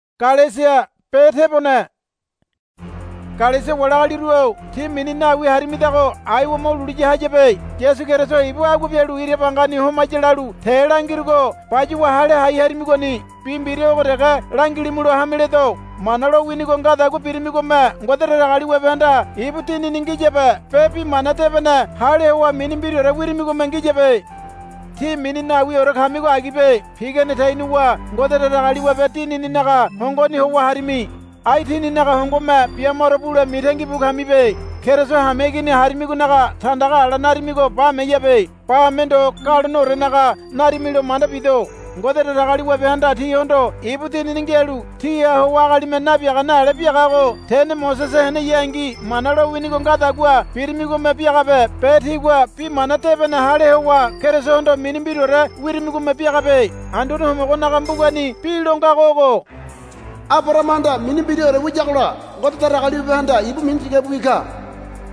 Galesia wali agaliru-o tí mini nawi harimidago aiwa mo lulu ya hayabe. Yasu Keriso ibu agua bialu ira bangani homaya lalu te langirugo bayuwa hale hai harimigoni. Bi mbira ogo dege langilimulo hame ledo. Mana lowinigo ngadagua birimigome Ngode Datagaliwabehanda ibu Dinini ngiyabe be Bi Mana Debene hale howa mini mbiraore wirimigome ngiyabe. Tí mini nawiore kamigo agibe. Pigane tenuwa Ngode Datagaliwabe Dinininaga hongoni howa harimi. Ai tíninaga hongome bia maro bule mitangi bu kamibe. Keriso hameigini harimigonaga tandaga ala narimigo bameyabe. Bame ndo galoneorenaga narimilo manda bido. Ngode Datagaliwabehanda tíhondo ibu Dinini ngialu tíha howa agalime nabiagane ale biagago tene Mosese heneyangi Mana lowinigo ngadagua birimigome biagabe be tígua Bi Mana Debene hale howa Kerisohondo mini mbiraore wirimigome biagabe. Anduane Homogonaga mbugani bi lo ngago ogo, Abarahamahanda mini mbiraore wiyagola Ngode Datagaliwabehanda ibu mini tigabiwi ka,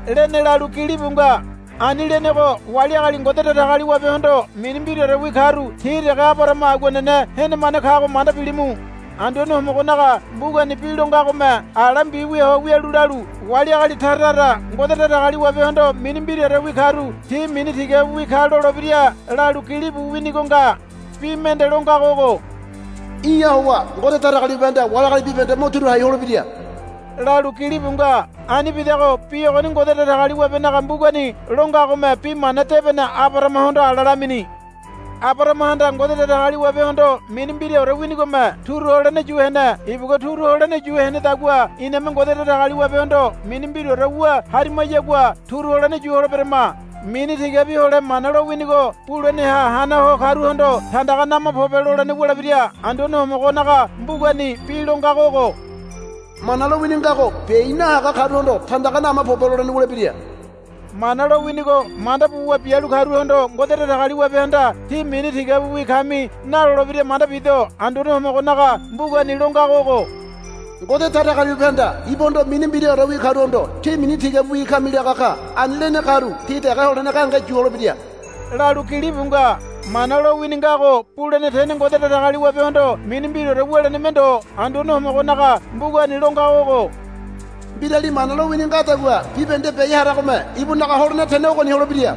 lene lalu gilibu nga. Ani lenego wali agali Ngode Datagaliwabehondo mini mbiraorewi karu ti dege Abarahama aguanene henemane kago manda bilimu. Anduane Homogonaga mbugani bi lo ngagome ala mbiwia ho wialu lalu, Wali agali tara tara Ngode Datagaliwabehondo mini mbiraorewi karu ti mini tigabiwi ka lolebira, lalu gilibu winigo nga. Bi mende lo ngago ogo, Í̠ha howa Ngode Datagaliwabehanda wali agali bibahende mo turu hai holebira, lalu gilibu nga. Anibidago bi ogoni Ngode Datagaliwabenaga mbugani lo ngagome Bi Mana Debene Abarahamahondo ala lamini. Abarahamahanda Ngode Datagaliwabehondo mini mbiraore winigome turu holene yu hene. Ibugua turu holene yu henedagua iname Ngode Datagaliwabehondo mini mbiraore wu harimayagua turu holene yu holeberama. Mini tigabi hole Mana lowinigo buleneha hana ho karuhondo, Tandaga nama pobe, lolene wulebira. Anduane Homogonaga mbugani bi lo ngago ogo, Mana lowini ngago biai nahaga karuhondo, Tandaga nama pobe, lolene wulebira. Mana lowinigo manda buwa bialu karuhondo Ngode Datagaliwabehanda, Tí mini tigabiwi kami, nalolebira manda bido. Anduane Homogonaga mbugani lo ngago ogo, Ngode Datagaliwabehanda ibuhondo mini mbiraorewi karuhondo, Tí mini tigabiwi kami, laga ka. Ani lene karu ti dege holene gahenge yu holebira, lalu gilibu nga. Mana lowini ngago bulene tene Ngode Datagaliwabehondo mini mbiraore wuleneme ndo. Anduane Homogonaga mbugani lo ngago ogo, Mbirali Mana lowini ngadagua bibahende biai haragome ibunaga holene tene ogoni holebira,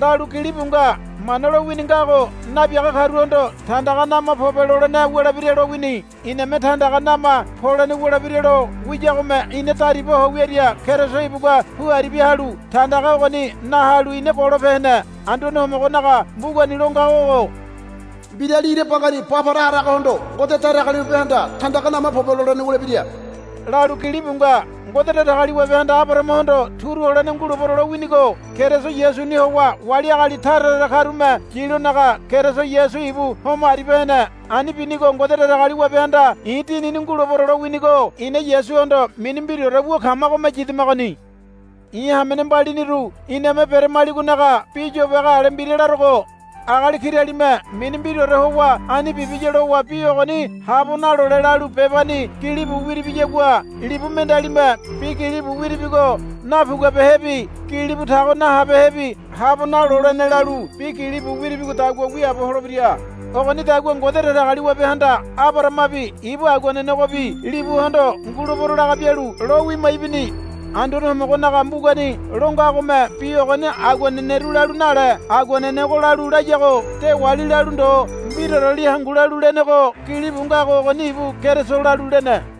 lalu gilibu nga. Mana lowini ngago nabiaga karuhondo, Tandaga nama pobe, lolene wulebira lowini. Iname tandaga nama polene wulebira lo wiyagome ina dariba ho wiaria Keriso ibugua pu aribia halu tandaga ogoni na halu ina golope hene. Anduane Homogonaga mbugani lo ngago ogo, Mbirali ira bangani ba para haragohondo Ngode Datagaliwabehanda, Tandaga nama pobe, lolene wulebira, lalu gilibu nga. Ngode Datagaliwabehanda Abarahamahondo turu holene ngulebero lowinigo Keriso Yasuni howa wali agali tara tara karume yilonaga Keriso Yasu ibu homo aribia hene. Ani binigo Ngode Datagaliwabehanda, I̱ Dinini ngulebero, lowinigo ina Yasuhondo mini mbiraore wu kamagome yidamagoni. I̱ hamene mbaliniru iname beramaligonaga bi yobage ale mbira larogo. Agali kiralime mini mbiraore howa ani bibiya lowa bi ogoni habo nalole lalu bebani gilibu wiribiyagua libu mendealime bi gilibu wiribigo napuguabehebi gilibu tago nahabehebi habo nalolene lalu bi gilibu wiribigodagua wiaabo holebira. Ogonidagua Ngode Datagaliwabehanda Abarahamabi ibu aguanenegobi libuhondo ngulebero laga bialu lo wima ibini. Anduane Homogonaga mbugani lo ngagome bi ogoni aguaneneru lalu nale aguanenego lalu layago dewali lalu ndo mbiraoreli hangu lalu lenego gilibu ngago ogoni ibu Keriso lalu lene.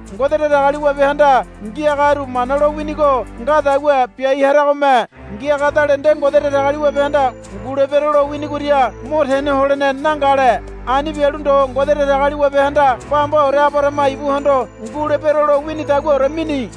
Ngode Datagaliwabehanda ngiagaru Mana lo winigo ngadagua biai haramagome ngiagadale nde Ngode Datagaliwabehanda ngulebero lo winigoria mo tene holene nangale. Ani bialu ndo Ngode Datagaliwabehanda bambaore Abarahama ibuhondo ngulebero lo winidaguaore mini.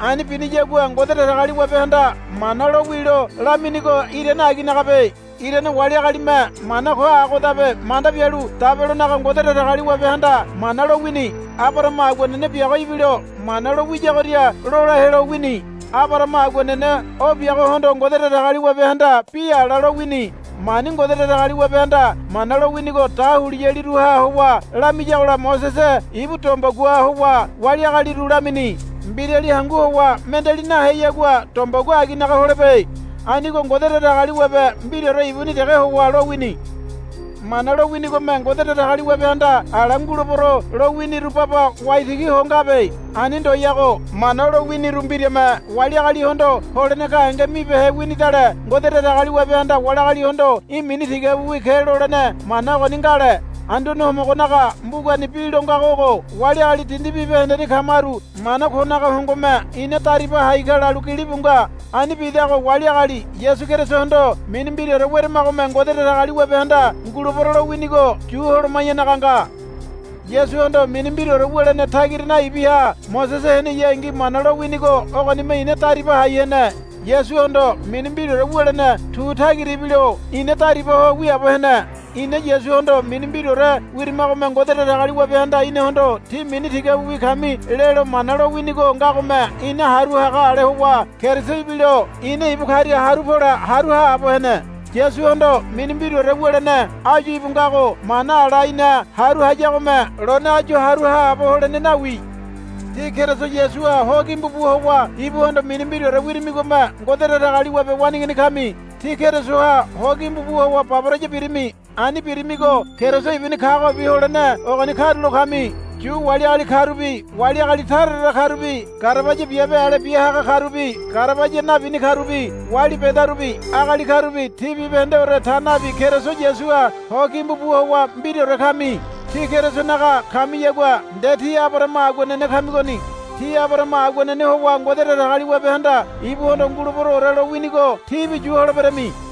Ani biniyagua Ngode Datagaliwabehanda Mana lo wilo laminigo irane aginagabe. Irane wali agalime mana ko agodabe manda bialu dabelonaga Ngode Datagaliwabehanda Mana lowini. Abarahama aguanene biago ibilo mana lo wiyagoria lola helo wini. Abarahama aguanene o biagohondo Ngode Datagaliwabehanda bi ala lowini. Mani Ngode Datagaliwabehanda Mana lowinigo dahuliyaliruha howa lamiyagola Mosese ibu dombegua howa wali agaliru lamini. Mbirali hangu howa mendeali naheyagua dombegua aginaga holebe. Anigo Ngode Datagaliwabe mbiraore ibuni dege howa lowini. Mana lo winigome Ngode Datagaliwabehanda ala, Ngulebero, lo winiru baba waitigi ho ngabe. Ani ndoyago. Mana lo winiru mbirame wali agalihondo holene gahenge mibehe winidale Ngode Datagaliwabehanda wali agalihondo, Í̠ mini tigabiwi ke, lolene mana ogoni ngale. Anduane Homogonaga mbugani bi lo ngago ogo, Wali agali dindi bibahendeni kamaru mana konaga hongome ina dariba hai ka, lalu gilibu nga. Ani bidago wali agali Yasu Kerisohondo mini mbiraore weramagome Ngode Datagaliwabehanda, Ngulebero, lowinigo yu holoma̱yanaga nga. Yasuhondo mini mbiraore wulene tagira naibiha Mosese heneyangi Mana lowinigo ogonime ina dariba hai hene. Yasuhondo mini mbiraore wulene tu tagira ibilo ina dariba ho wiaabo hene. Ina Yasuhondo mini mbiraore wirimagome Ngode Datagaliwabehanda inahondo, Tí mini tigabiwi kami, lelo Mana lowinigo ngagome ina haru haga ale howa Keriso ibilo ina ibu karia haru pole haru haabo hene. Yasuhondo mini mbiraore wulene áyu íbu ngago mana ala ina haru hayagome lone áyu haru haabo holene nawi. Tí Keriso Yasuha ho gimbu bu howa ibuhondo mini mbiraore wirimigome Ngode Datagaliwabe waneigini kami. Tí Kerisoha ho gimbu bu howa baboraya birimi. Ani birimigo Keriso ibuni kagobi holene ogoni karulo kami. Yu wali agali karubi wali agali tara tara karubi garabaya biabe ale bia haga karubi garabaya nabini karubi wali bedarubi agali karubi tí bibahendeore ta nabi Keriso Yasuha ho gimbu bu howa mbiraore kami. Tí Kerisonaga kamiyagua nde tí Abarahama aguanene kamigoni. Tí Abarahama aguanene howa Ngode Datagaliwabehanda ibuhondo, Nguleberoore, lo winigo tíbi yu holeberami.